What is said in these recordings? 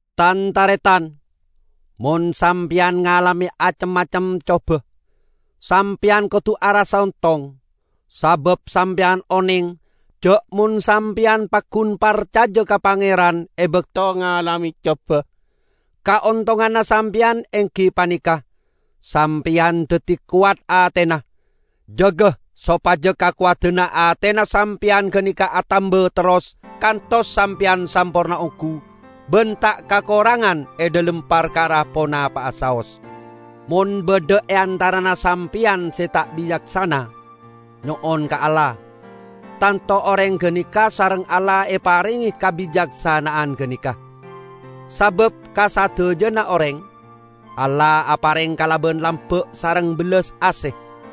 Tan-taretan, mon sampeyan ngalame acem-macem coba, sampeyan kodu arassa ontong. Sabab sampeyan oneng, ja' mon sampeyan paggun parcaja ka Pangeran e bakto ngalame coba, kaontonganna sampeyan enggi paneka: sampeyan daddi kowat atena. Jaga sopaja kakowadanna atena sampeyan ganeka atamba terros kantos sampeyan samporna onggu ban ta' kakorangan e dhalem parkara ponapa'a saos. Mon badha e antarana sampeyan se ta' bicaksana, nyo'on ka Allah, tanto oreng ganeka sareng Allah eparenge kabicaksana'an ganeka; sabab ka sadajana oreng, Allah apareng kalaban lamba' sareng bellas ase.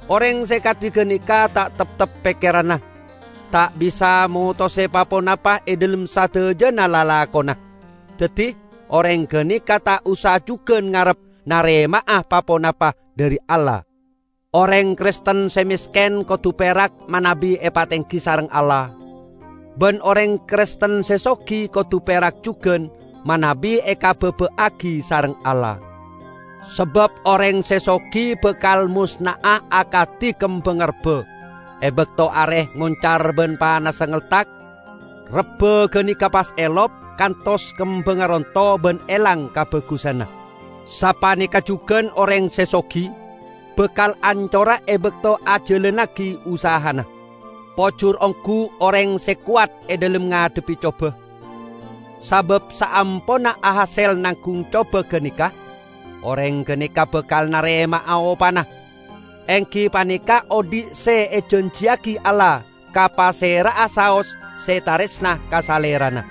Oreng se kadi ganeka ta' teptep pekkeranna; ta' bisa motose pa-ponapa e dhalem sadajana lalakonna. Daddi, oreng ganeka ta' osa jugan ngarep narema'a pa-ponapa dhari Allah. Oreng Kristen se mesken kodu perak manabi epatenggi sareng Allah. Ban oreng Kristen se sogi kodu perak jugan manabi ekababa'agi sareng Allah. Sabab oreng se sogi bakal mosna'a akadi kembangnga rebba. E bakto are moncar ban panassa ngeltak, rebba ganeka pas elop, kantos kembangnga ronto ban elang kabagusanna. Sapaneka jugan oreng se sogi, bakal ancora e bakto ajalannagi usahana. Pojur onggu oreng se kowat e dhalem ngadhebbi coba. Sabab saamponna ahasel nanggung coba ganeka, oreng ganeka bakal narema'a opana, enggi paneka odhi' se ejanjiyagi Allah ka pasera'a saos se taresna ka Salerana.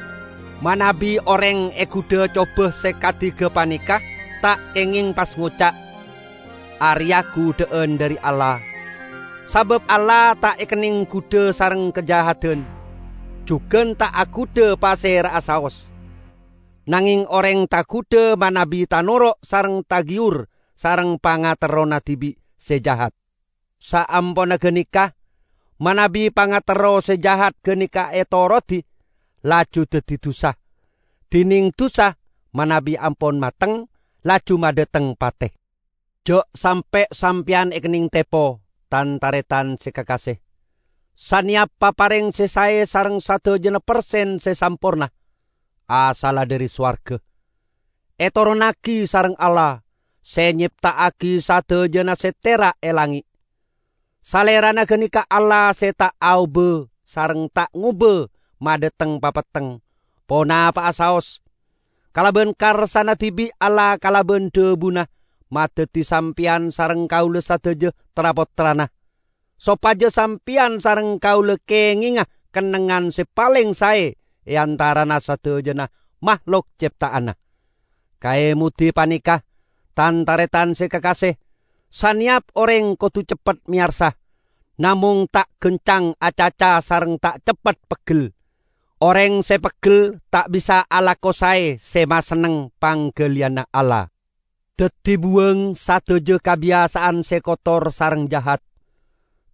Manabi oreng egudha coba se kadi gapaneka, ta' kengeng pas ngoca', "Areya gudha'an dhari Allah," sabab Allah ta' ekenneng gudha sareng kajahadan, jugan ta' agudha pasera'a saos. Nangeng oreng tagudha manabi tanoro' sareng tagiyur sareng pangaterrona dibi' se jahat. Saamponna ganeka, manabi pangaterro se jahat ganeka etorodi, laju daddi dusa; dineng dusa, manabi ampon mateng, laju madhateng pate. Ja' sampe' sampeyan ekenneng tepo, tan-taretan se kakase! Saneyap papareng se sae sareng sadajana persen se samporna, asalla dhari sowarga; etoronnagi sareng Allah, se nyepta'agi sadajana se tera' e langnge'. Salerana ganeka Allah se ta' aoba, sareng ta' ngoba madhateng papetteng ponapa'a saos. Kalaban karsana dibi' Allah kalaban dhabuna madaddi sampeyan sareng kaula sadaja tra-pottrana. Sopaja sampeyan sareng kaula kengenga kennengngan se paleng sae e antarana sadajana mahlok cepta'anna. Kaemodi paneka, tan-taretan se kakase! Saneyap oreng kodu ceppet meyarsa, namong ta' gancang acaca sareng ta' ceppet peggel. Oreng se peggel ta' bisa alako sae se masenneng panggaliyanna Allah. Daddi buwang sadaja kabiyasa'an se kotor sareng jahat.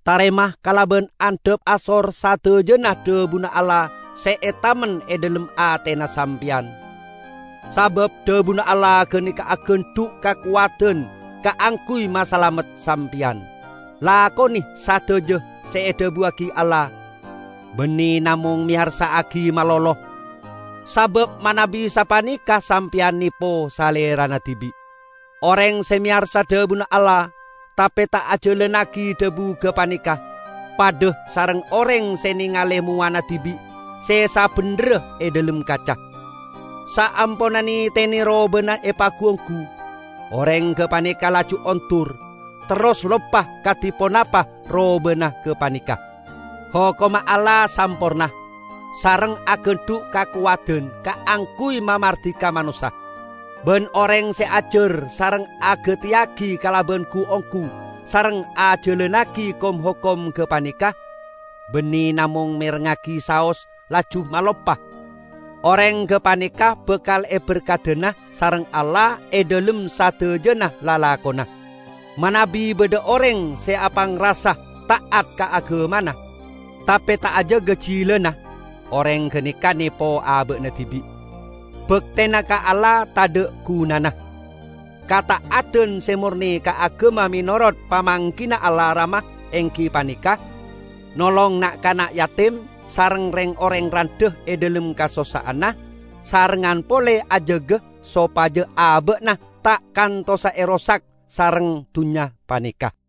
Tarema kalaban andhap asor sadajana dhabuna Allah se etamen e dhalem atena sampeyan, sabab dhabuna Allah ganeka agandhu' kakowadan kaangguy masalamet sampeyan. Lakone sadaja se edhabuwagi Allah; banne namong meyarsa'agi malolo, sabab manabi sapaneka sampeyan nepo salerana dibi'. Oreng se meyarsa dhabuna Allah, tape ta' ajalannagi dhabu gapaneka, padha sareng oreng se nengale mowana dibi' se sabendherra e dhalem kaca. Saamponna netene robana epagu-onggu, oreng gapaneka laju ondur, terros loppa kadi ponapa robana gapaneka. Hokomma Allah samporna, sareng agandhu' kakowadan kaangguy mamardika manossa. Ban oreng se ajar sareng agateyagi kalaban gu-onggu sareng ajalannagi kom-hokom gapaneka, banne namong merengngagi saos laju maloppa, oreng gapaneka bakal eberkadana sareng Allah e dhalem sadajana lalakonna. Manabi badha oreng se apangrasa ta'at ka agamana, tape ta' ajaga jilana, oreng ganeka nepo aba'na dibi'; baktena ka Allah tadha' gunana. Kata'adan se morne ka agama menorot pamanggina Allah Rama enggi paneka: nolong na'-kana' jatim sareng reng-oreng randha e dhalem kasossa'anna, sarengngan pole ajaga sopaja aba'na ta' kantosa erosak sareng dunnya paneka.